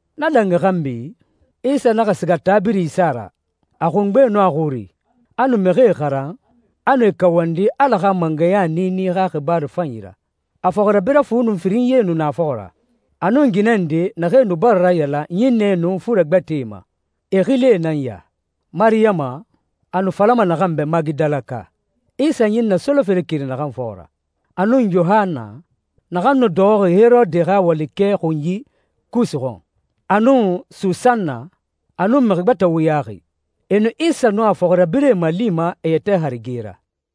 Na dangi xanbi, Isa naxa siga taa birin isa ra, a xungbe nun a xuri, a nu mixie xaran, a nu e kawandi Ala xa mangɛya niini xa xibaaru fanyi ra. A fɔxirabirɛ fu nun firinyie nu na a fɔxɔ ra, a nun ginɛ nde naxee nu bara rayalan ɲinnɛe nun fure gbɛtɛe ma. E xilie nan ya: Mariyama, a nu falama naxan bɛ Magidalaka, Isa ɲinnɛ solofere keri naxan fɔxɔ ra, a nun Yohanna, naxan nu dɔxɔxi Herode xa walikɛe xunyi Kusa xɔn, a nun Susanna, a nun mixi gbɛtɛ wuyaxi. E nu Isa nun a fɔxirabirɛe malima e yɛtɛ harige ra.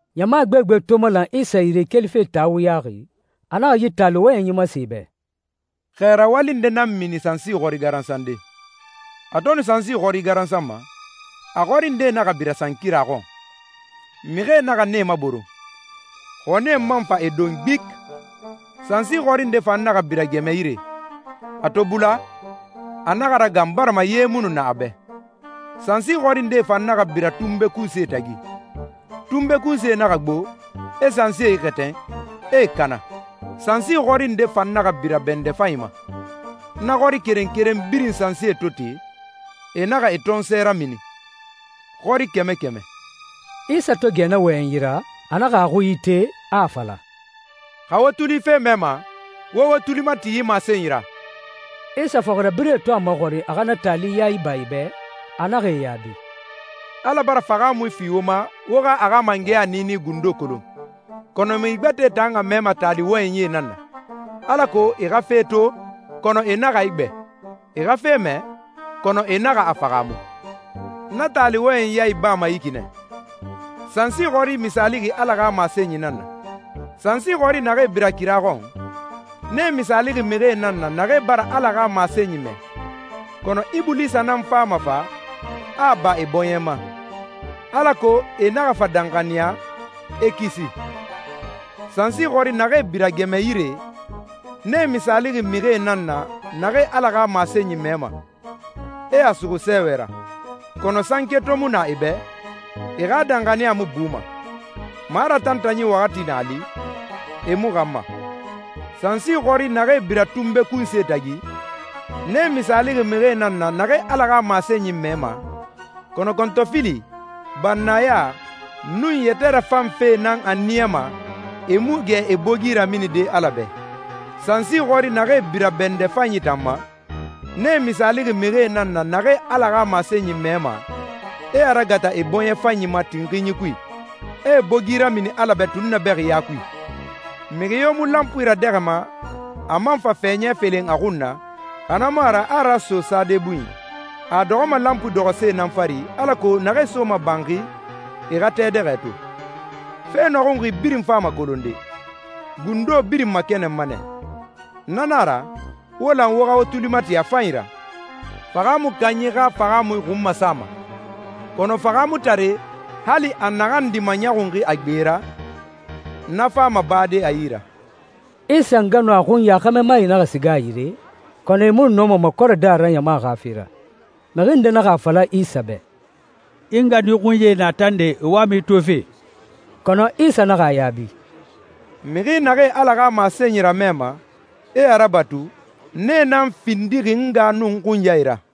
Ɲama gbegbe to malan Isa yire kelife taa wuyaxi, a naxa yi taali wɔyɛnyi masen e bɛ, «Xɛ rawali nde nan mini sansi xɔri garansande. A to nu sansi xɔri garansanma, a xɔri ndee naxa bira sankira xɔn, mixie naxa nee maboron, xɔnie man fa e don gbiki. Sansi xɔri nde fan naxa bira gɛmɛ yire. A to bula, a naxa ragan barima ye mu nu na a bɛ. Sansi xɔri ndee fan naxa bira tunbe kunsie tagi. Tunbe kunsie naxa gbo, e sansie ixɛtɛn, e e kana. Sansi xɔri nde fan naxa bira bɛndɛ fanyi ma. Na xɔri keren keren birin sansie to te, e naxa e tɔnsɔɛ ramini, xɔri kɛmɛ kɛmɛ.» Isa to gɛ na wɔyɛnyi ra, a naxa a xui ite, a a fala, «Xa wo tuli fe mɛma, wo wo tuli mati yi masenyi ra.» Isa fɔxirabirɛe to a maxɔrin a xa na taali ya iba e bɛ, a naxa e yaabi, «Ala bara fahaamui fi wo ma wo xa a xa mangɛya niini gundo kolon, kɔnɔ mixi gbɛtɛe tan a mɛma taali wɔyɛnyie nan na, alako ‹E xa fe to, kɔnɔ e naxa a igbɛ. E xa fe mɛ, kɔnɔ e naxa a fahaamu.›» «Na taali wɔyɛnyi ya ibama yi ki nɛ. Sansi xɔri misaalixi Ala xa masenyi nan na. Sansi xɔri naxee bira kira xɔn, nee misaalixi mixie nan na naxee bara Ala xa masenyi mɛ, kɔnɔ Ibulisa nan fama fa, a a ba e bɔɲɛ ma, alako e naxa fa danxaniya, e kisi. Sansi xɔri naxee bira gɛmɛ yire, nee misaalixi mixi nan na naxee Ala xa masenyi mɛma, e a suxu sɛɛwɛ ra. Kɔnɔ sanke to mu na e bɛ, e xa danxaniya mu buma. Maratantanyi waxati na a li, e mu xanma. Sansi xɔri naxee bira tunbe kunsie tagi, nee misaalixi mixie nan na naxee Ala xa masenyi mɛma, kɔnɔ kɔntɔfili, bannaya, nun yɛtɛ rafan fee nan a niyama e mu gɛ e bogi raminide Ala bɛ. Sansi xɔri naxee bira bɛndɛ fanyi tan ma, nee misaalixi mixie nan na naxee Ala xa masenyi mɛma, e a ragata e bɔɲɛ fanyi ma tinxinyi kui, e e bogi ramini Ala bɛ tunnabɛxiya kui.» «Mixi yo mu lanpui radɛxɛma, a man fa fɛɲɛ felen a xun na, xa na mu a ra a a raso sade bunyi. A a dɔxɔma lanpui dɔxɔse nan fari alako naxee soma banxi, e xa a tɛ dɛxɛ to. Fe nɔxunxi birin fama kolonde. Gundo birin makɛnɛnma nɛ. Na na a ra, wo lan wo xa wo tuli mati a fanyi ra. Fahaamui kanyi xa fahaamui xun masama, kɔnɔ fahaamutare, hali a naxan di maɲɔxunxi a gbe ra, na fama bade a yi ra.» Isa nga nun a xunya xɛmɛmae naxa siga a yire, kɔnɔ e mu nu nɔma makɔrɛde a ra ɲama xa fe ra. Mixi nde naxa a fala Isa bɛ, «I nga nun i xunyae na tande, e wama i tofe.» Kɔnɔ Isa naxa a yaabi, «Mixi naxee Ala xa masenyi ramɛma, e a rabatu, nee nan findixi n nga nun n xunyae ra.»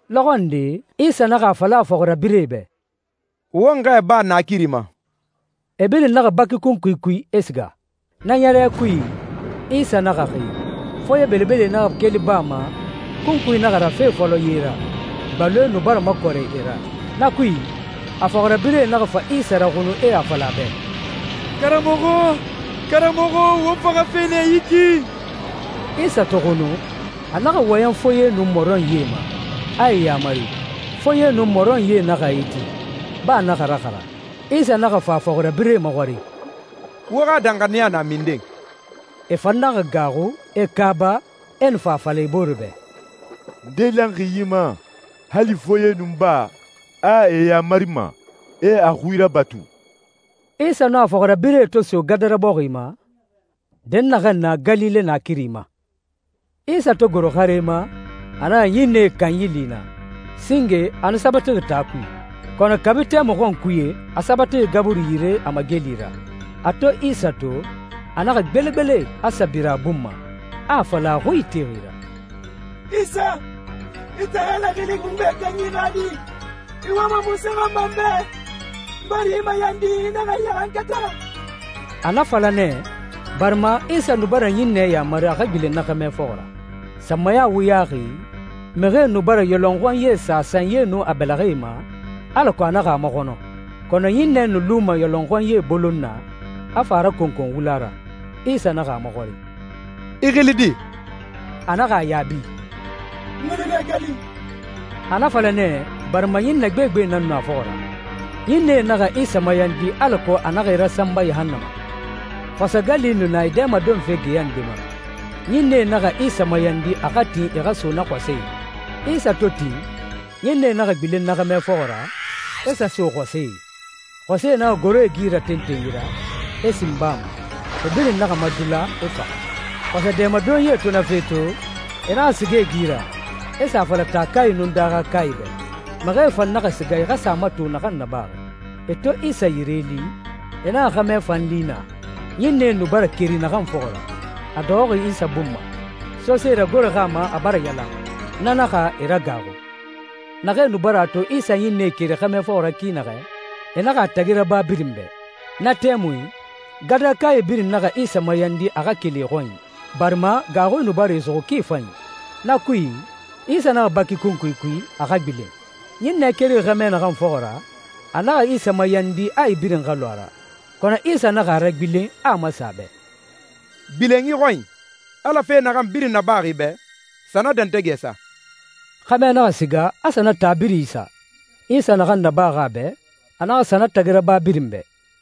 Lɔxɔ nde, Isa naxa a fala a fɔxirabirɛe bɛ, «Won xɛɛ baa naakiri ma.» E birin naxa baki kunkui kui, e siga. Na ɲɛrɛ kui, Isa naxa xi. Foye belebele naxa keli baa ma, kunkui naxa rafe fɔlɔ ye ra. Gbaloe nu bara makɔrɛ e ra. Na kui, a fɔxirabirɛe naxa fa Isa raxunu e a fala a bɛ, «Karamɔxɔ, karamɔxɔ, won faxafe nɛ yi ki!» Isa to xunu, a naxa wɔyɛn foye nun mɔrɔnyie ma, a e yaamari. Foye nun mɔrɔnyie naxa a iti, baa naxa raxara. Isa naxa fa a fɔxirabirɛe maxɔrin, «Wo xa danxaniya na minden?» E fan naxa gaaxu, e kaaba, e nu a fala e bore bɛ, «Nde lanxi yi ma? Hali foye nun baa, a e yamarima, e a xui rabatu.» Isa nun a fɔxirabirɛe to so Gadara bɔxi ma, dɛnnaxɛ na Galile naakiri ma, Isa to goro xare ma, a naxa ɲinnɛe kanyi li naa. Singe a nu sabatixi taa kui, kɔnɔ kabi tɛmui xɔnkuye a sabatixi gaburi yire a mageli ra. A to Isa to, a naxa gbelegbele, a sa bira a bun ma, a a fala a xui itexi ra, «Isa, i tan Ala Xili Xungbe Kanyi xa Di, i wama munse xɔn ma n bɛ? N bara i mayandi, i naxa n ɲaxankata.» A na fala nɛ, barima Isa nu bara ɲinnɛ yamari a xa gbilen na xɛmɛ fɔxɔ ra. Sanmaya wuyaxi, mixie nu bara yɔlɔnxɔnyi sa a sanyie nun a bɛlɛxɛe ma, alako a naxa a maxɔnɔ, kɔnɔ ɲinnɛ nu luma yɔlɔnxɔnyie bolon na, a fa a rakonkon wula ra. Isa naxa a maxɔrin, «I xili di?» A naxa a yaabi, «N xili nɛ Gali.» A na fala nɛ barima ɲinnɛ gbegbe nan nu a fɔxɔ ra. Ɲinnɛe naxa Isa mayandi alako a naxa e rasanba yahannama. Xɔsɛ gali nu na e dɛmadonfe geya nde ma. Ɲinnɛe naxa Isa mayandi a xa tin e xa sa so na xɔsɛe. Isa to tin, ɲinnɛe naxa gbilen na xɛmɛ fɔxɔ ra, e sa so xɔsɛe. Xɔsɛe naxa goro e gi ra tentenyi ra, e sin baa ma. E birin naxa madula, e faxa. Xɔsɛ dɛmadonyie to na fe to, e naxa siga e gi ra, e sa a fala taakae nun daaxakae bɛ, mixie fan naxa siga e xa sa a mato naxan nabaxi. E to Isa yire li, e naxa xɛmɛ fan li naa, ɲinnɛe nu bara keri naxan fɔxɔ ra, a dɔxɔxi Isa bun ma, sose ragoroxi a ma, a bara yalan. Na naxa e ragaaxu. Naxee nu bara a to Isa ɲinnɛe keri xɛmɛ fɔxɔ ra ki naxɛ, e naxa a tagi raba birin bɛ. Na tɛmui, Gadarakae birin naxa Isa mayandi a xa keli e xɔnyi, barima gaaxui nu bara e suxu ki fanyi. Na kui, Isa naxa baki kunkui kui, a xa gbilen. Ɲinnɛ kerixi xɛmɛ naxan fɔxɔ ra, a naxa Isa mayandi a e birin xa lu a ra. Kɔnɔ Isa naxa a ragbilen, a a masen a bɛ, «Gbilen i xɔnyi. Ala fe naxan birin nabaxi i bɛ, sa na dɛntɛgɛ sa.» Xɛmɛ naxa siga, a sa na taa birin isa. Isa naxan nabaxi a bɛ, a naxa sa na tagi raba birin bɛ.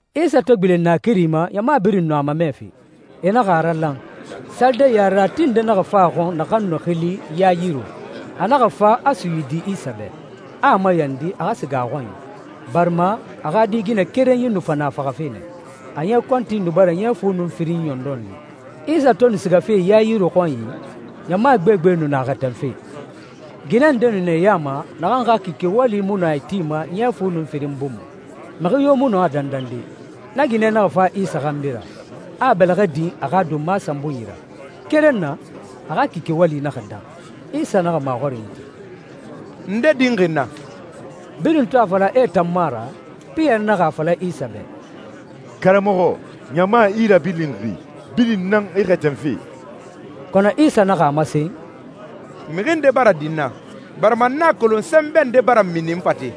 Isa to gbilen naakiri ma, ɲama birin nu a mamɛfe. E naxa a ralan. Salide yarerati nde naxa fa a xɔn naxan nu xili Yayiru. A naxa fa a suyidi Isa bɛ, a a mayandi a xa siga a xɔnyi, barima a xa di ginɛ kerenyi nu fa na faxafe nɛ. A ɲɛ kɔnti nu bara ɲɛ fu nun firin ɲɔndɔn li. Isa to nu sigafe Yayiru xɔnyi, ɲama gbegbe nu na a xɛtɛnfe. Ginɛ nde nu na e ya ma naxan xa kike wali mu nu a itima ɲɛ fu nun firin bun ma, mixi yo mu nɔ a dandande. Na ginɛ naxa fa Isa xanbi ra, a a bɛlɛxɛ din a xa donma sanbunyi ra. Keren na, a xa kike wali naxa dan. Isa naxa maxɔrinyi ti, «Nde dinxi n na?» Birin to a fala a e tan mu a ra, Piyɛri naxa a fala Isa bɛ, «Karamɔxɔ, ɲama i rabilinxi, birin nan i xɛtɛnfe!» Kɔnɔ Isa naxa a masen, «Mixi nde bara din n na, barima n a kolon sɛnbɛ nde bara mini n fate.»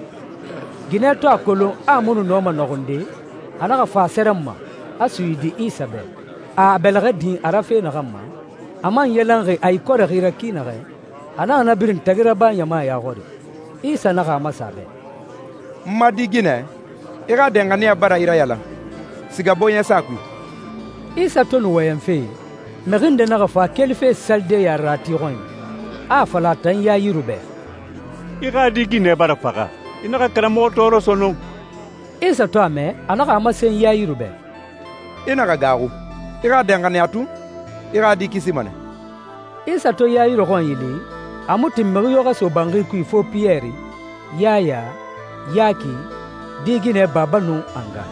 Ginɛ to a kolon a a mu nu nɔma a nɔxunde, a naxa fa a sɛrɛnma, a suyidi Isa bɛ. A a bɛlɛxɛ dinxi a ra fe naxan ma, a man yalanxi a ikɔrɛxi ra ki naxɛ, a naxa na birin tagi raba ɲama ya xɔri. Isa naxa a masen a bɛ, «N ma di ginɛ, i xa danxaniya bara i rayalan. Siga bɔɲɛsa kui.» Isa to nu wɔyɛnfe, mixi nde naxa fa kelife salide yarerati xɔnyi, a a fala a tan Yayiru bɛ, «I xa di ginɛ bara faxa. I naxa karamɔxɔ tɔɔrɔ sɔnɔn.» Isa to a mɛ, a naxa a masen Yayiru bɛ, «I naxa gaaxu. I xa danxaniya tun. I xa di kisima nɛ.» Isa to Yayiru xɔnyi li, a mu tin mixi yo xa so banxi kui fo Piyɛri, Yaya, Yaki, di ginɛ baba nun a nga.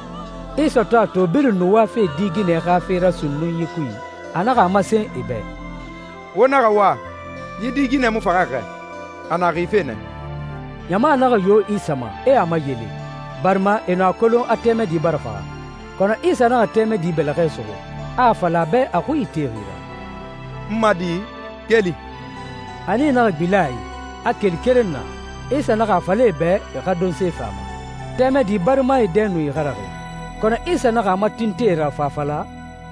Isa to a to birin nu wafe di ginɛ xa fe ra sunnunyi kui, a naxa a masen e bɛ, «Wo naxa wa. Yi di ginɛ mu faxaxi xɛ, a na xife nɛ.» Ɲama naxa yo Isa ma, e a mayele, barima e nu a kolon a tɛmɛdi bara faxa. Kɔnɔ Isa naxa tɛmɛdi bɛlɛxɛ suxu, a a fala a bɛ a xui itexi ra, «N ma di, keli!» A nii naxa gbilen a i, a keli keren na. Isa naxa a fala e bɛ e xa donse fi a ma. Tɛmɛdi barimae dɛ nu ixaraxi, kɔnɔ Isa naxa a matintin e ra fa a fala,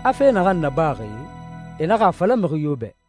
a fe naxan nabaxi, e naxa a fala mixi yo bɛ.